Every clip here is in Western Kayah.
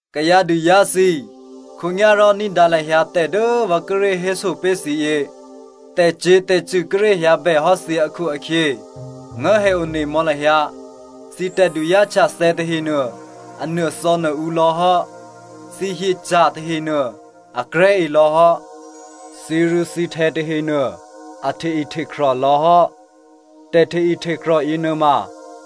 Kayǎduzá̤ thǐ꤮ khǒnyá̤rò ní̤dǎ lahyǎ tè̤ dố vǎ kíré̤ héso pé̤ thǐ yě. Tè̤cyě̤tè̤cṳ̂ kíré̤ hyǎbèhò́ thǐ akhu-akhyě nguố̤hè onemò̌ lahyǎ. Thǐ tè̤duzá̤htyathè̌ tahenuô a nuô̤thò̌nuô̤ǔ lò̌ hò́. Thǐhyethǐca̤ tahenuô akrè̤́ elò̌ hò́. Thǐrû̌thǐhtè̌ tahenuô a hte-ihtekrè́ lò̌hò́. Tè̤hte-ihtekrè́ yěnuôma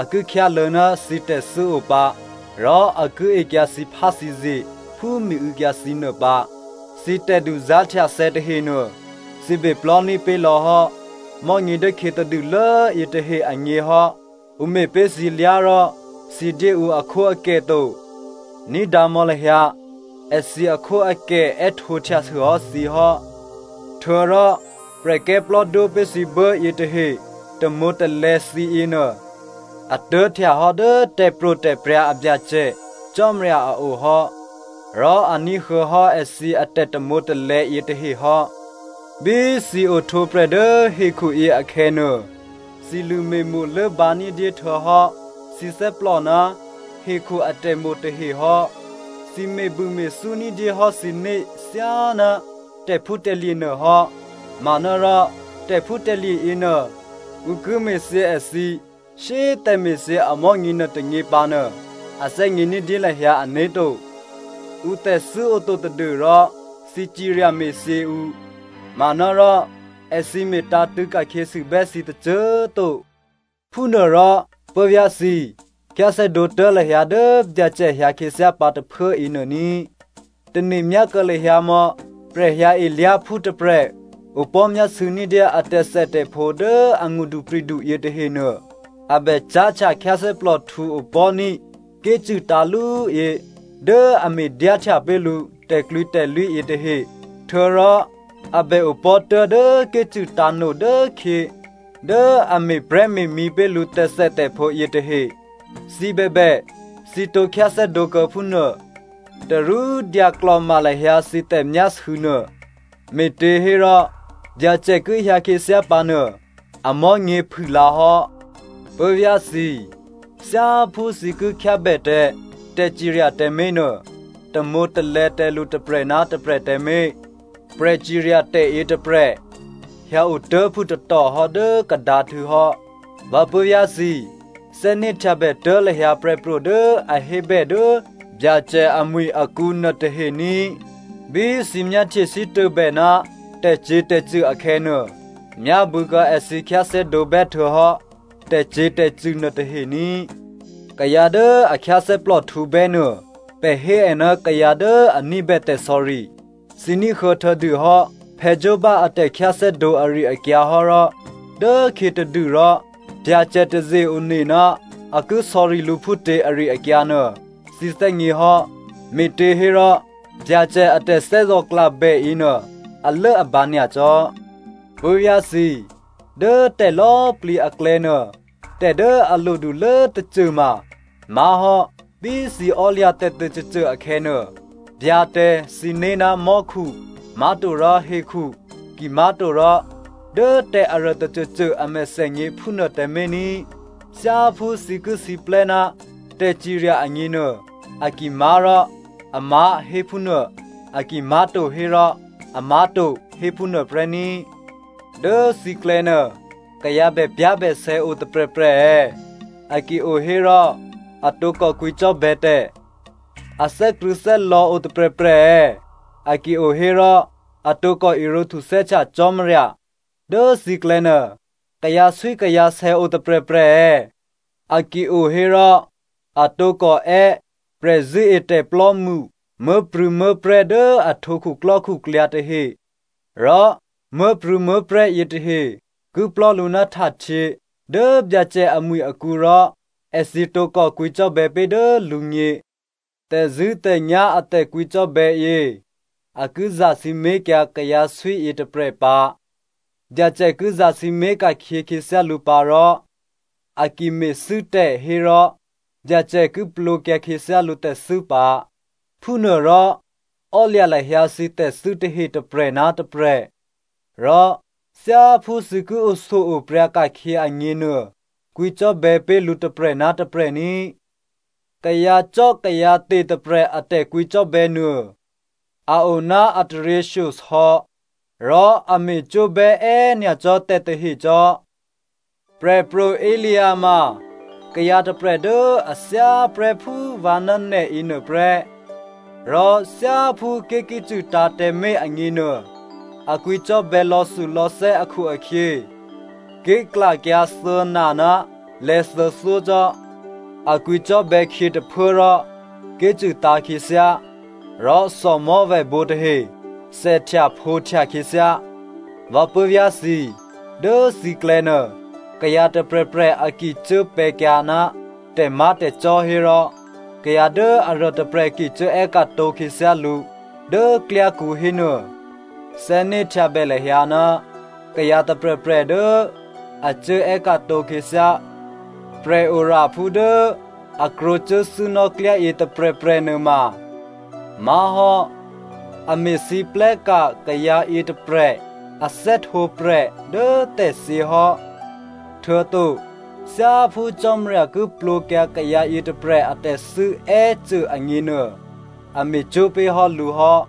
a ki khyáluô̌ ná thǐ tè̤thû́ o pǎ rò a ki ekyǎ thǐpháthǐzye phú miû̌kyǎ thǐ nuô pǎ. Thǐ tè̤duzá̤htyathè̌ tahenuô, thǐ beplò́ní̤ pé̤ lò̌hò́ mò̤́nyě dố khyětadûlố yětahe agně hò́. Ǔ me̤pé̤ thǐlyá̤ rò thǐ dyé ǔ akhwóakè to. Ní̤dǎ mò̌ lahyǎ, èthǐ akhwóakè è́htǒhtyasûhò́ thǐ hò́. Htuô̌rò prè̤kè́plò́dwó pé̤ thǐ buố yětahe tamwǒ̤talè̌ thǐ yěnuô a tuố̤htyahò́ dố tè̤pro̤tè̤prya̤ a Byacè Cò́marya a ohò́, rò a ní̤huô̌ hò́ èthǐ atè̤tamwǒ̤talè̌ yětahe hò́. Bí thǐ ohtwǒprè̤ dố hekhuyě akhè̌nuô, thǐ lṳ̂me̤mo̤ lốbǎ ní̤dyé htuô̌hò́ thǐ thè́plò ná hekhu atè̤mo̤ tahe hò́. Thǐ me̤bûme̤thú ní̤dyé hò́ thǐné̤ thyáná tè̤phútè̤lye̤ nuôhò́, manárò tè̤phútè̤lye̤ yěnuô ǔ ki me̤thyě èthǐ shyé꤮ tè̤me̤thyě amò̤́nyě nuôtônyě pǎnuô a thè́gně ní̤dyé lahyǎ ané̤to. Ǔtè̤thû́ oto tadû́rò thǐ cirya me̤thyěkyǎ ǔ, manárò èthǐ me̤tǎ̤tṳ̂̌ ka̤khyěsûbè́ thǐ tôcô꤮ to. Phúnuôrò puố̤vyá̤ thǐ꤮, khyáthè́dǒ tuố̤ lahyǎ dố Byacè hyǎ khyěthyá pǎ tôphuố yěnuô ní꤮. Tane̤myá kuô̌ lahyǎ mò̌ prè̤hyǎelyá̤phú tôprè̤ opò̤́myásû̌ ní̤dyé a tè̤thètè̤phǒ dố angṳdupri̤du yětahenuô. A bè cáhtya khyáthè́plòhtǔ opò̤́ní̤ ké̤cṳ̂ tǎ̤ lú yě dố a me̤dyáhtya pé̤ lǔ tè̤klwǐtè̤lwí yětahe, htuô̌rò a bè opò̤́ tuố̤dố ké̤cṳ̂ tǎ̤no dốkhyě dố a me̤prè̤́me̤mǐ pé̤ lǔ tè̤thètè̤phǒ yětahe. Thǐ bèbè thǐ tǒ khyáthè́dǒkuô̌ phúnuô. Tarú dyaklò̤ma lahyǎ thǐ tè̤myásû̌ nuô, me̤těhérò Byacè ki hyǎ khyěthyá pǎnuô, amò̤́nyě phûlǎ hò́. Puố̤vyá̤ thǐ꤮, thyáphú thǐ ki khyábè tǎ tè̤cirya tǎmé̤nuô, tamwǒ̤talè̌ tǎ lǔ tôprè̤ ná tôprè̤ tǎmé̤. Prè̤cirya tè̤ yětôprè̤ hyǎotuố̤phû tatòhò́ dố kadǎhtû̌ hò́. Vǎ puố̤vyá̤ thǐ꤮, thè́né̤htyabè tuố̤ lahyǎ prè̤pro̤ dố a hébè dố Byacè amwi̤ akǔ nuôtahe ní꤮. Bí thǐ myáhtye sítôbè ná tè̤cyě̤tè̤cṳ̂ akhè̌nuô, myábû̌kuô̌ èthǐ khyáthè́dǒbè́ htuô̌hò́ tè̤cyě̤tè̤cṳ̂ nuôtahe ní꤮. Kayǎ dố a khyáthè́plòhtǔ bè́ nuô, pè̤ hé è ná kayǎ dố a ní̤bè tè̤sò̌ri. Thǐ ní̤huô̌ htuô̌dûhò́ Joba a tè̤khyáthè́dǒ ari-akyǎ hò́ rò dố khyětadû rò Byacè taze-one ná a ki sò̌ri lǔ phútě ari-akyǎ nuô, thǐ thè́gně hò́. Me̤těhérò Byacè a tè̤thè́zò̤klabè yěnuô alốabǎ nyacò́. Puố̤vyá̤ thǐ꤮, dố tè̤lò̌꤮ plǐ aklè̌nuô, tè̤ dố a lodulố꤮ tôcôma má̤hò́ bí thǐ ò́lya̤ tè̤tôcôcô akhè̌nuô, byǎ tǎ thǐné̤ ná mò́khu, má̤torò hekhu, kimá̤torò dố tè̤ aruô tôcôcô a mèthènyě phúnuô tǎmé̤ ní꤮. Thyáphú thǐ ki siplè́ ná tè̤cirya agněnuô, a ki má̤ rò “amá̤,” hé phúnuô, a ki má̤to hérò “amá̤to,” hé phúnuô prè́ ní꤮. Dố thǐklè̌ nuô, kayǎ bèpyá̤bèsè̌ o tôprè̤prè̤ è̌? A ki o hérò, a tǒkò kwǐcò́bè̌ tè̤. A thè́krṳ̂̌thè́lò̌ o tôprè̤prè̤ è̌? A ki o hérò, a tǒkò irǒ htuthè́htya Cò́marya. Dố thǐklè̌ nuô, kayǎswíkayǎsè̌ o tôprè̤prè̤ è̌? A ki o hérò, a tǒkò è́ prè̤zṳ̂́etè̤plò́mṳ muố̤prû̌muố̤prè̤́ dố a htwǒ khuklò́khuklyǎ tahe rò muố̤prû̌muố̤prè̤́ yětahe ki plò̤́ lǔ ná htahtyě dố Byacè amwi̤ akǔ rò èthǐ tǒkò kwǐcò́bè̌ pé̤ dố lǔgně. Tè̤zṳ̂́tè̤nyá̤ a tè̤kwǐcò́bè̌ yě a ki zasǐmé̤kyǎ kayǎswí yětôprè̤ pǎ. Byacè ki zasǐmé̤ ka̤khyě khyěthyá lǔ pǎ rò a ki me̤thû́ tè̤ hérò Byacè ki plwǒkyǎ khyěthyá lǔ tè̤thû́ pǎ. Phúnuôrò, ò́lya̤ lahyǎ thǐ tè̤thû́ tahe tôprè̤ ná tôprè̤, rò thyáphú thǐ ki oshyo-opryǎ ka̤khyě agněnuô, kwǐcò́bè̌ pé̤ lǔ tôprè̤ ná tôprè̤ ní꤮. Kayǎcò́kayǎte̤ tôprè̤ a tè̤kwǐcò́bè̌ nuô a o ná a taryěshyosò̌ rò a me̤cwó̤bè́ è́꤮ nyacò́ tè̤tahe cò́. Prè̤pro̤ Elia ma kayǎ tôprè̤ dố a thyáprè́ phú vǎ ná nè̤ yěnuôprè́. Rò thyáphú ké̤ ki cṳ̂tǎ̤ tǎmé̤ agněnuô, a kwǐcò́bè̌ lò̌thulò̌thè́ akhu-akhyě, ké̤klakyǎ thuô̌na ná lè̌thuô̌thyó cò́. A kwǐcò́bè̌ khyě tôphuố rò ké̤cṳ̂ tǎ̤ khyěthyá, rò thòmò̤́vèbǒ tahe thèhtyaphǒhtya khyěthyá. Vǎ puố̤vyá̤ thǐ꤮, dố thǐklè̌nuô kayǎ tôprè̤prè̤ a ki cuốpè̤̌kyǎ ná tè̤má̤tè̤cò́ hérò kayǎ dố aruôtôprè̤ ki cuố è́ka̤tǒ khyěthyá lǔ dố klyákǔ hénuô, thè́né̤htyabè lahyǎ, kayǎ tôprè̤prè̤ dố a cuố è́ka̤tǒ khyěthyá prè̤oraphú dố a krwǒ cuốthû́nò́ klyá yětôprè̤prè̤ nuôma má̤hò́ a me̤lwóhteka̤ kayǎ yětôprè̤ a thè́htwǒprè̤ dố tè̤thyě hò́. Htuô̌to thyáphú Cò́marya ki plwǒkyǎ kayǎ yětôprè̤ atè̤thû́ è́cô agněnuô, a me̤cwó̤ pé̤hò́ lǔ hò́.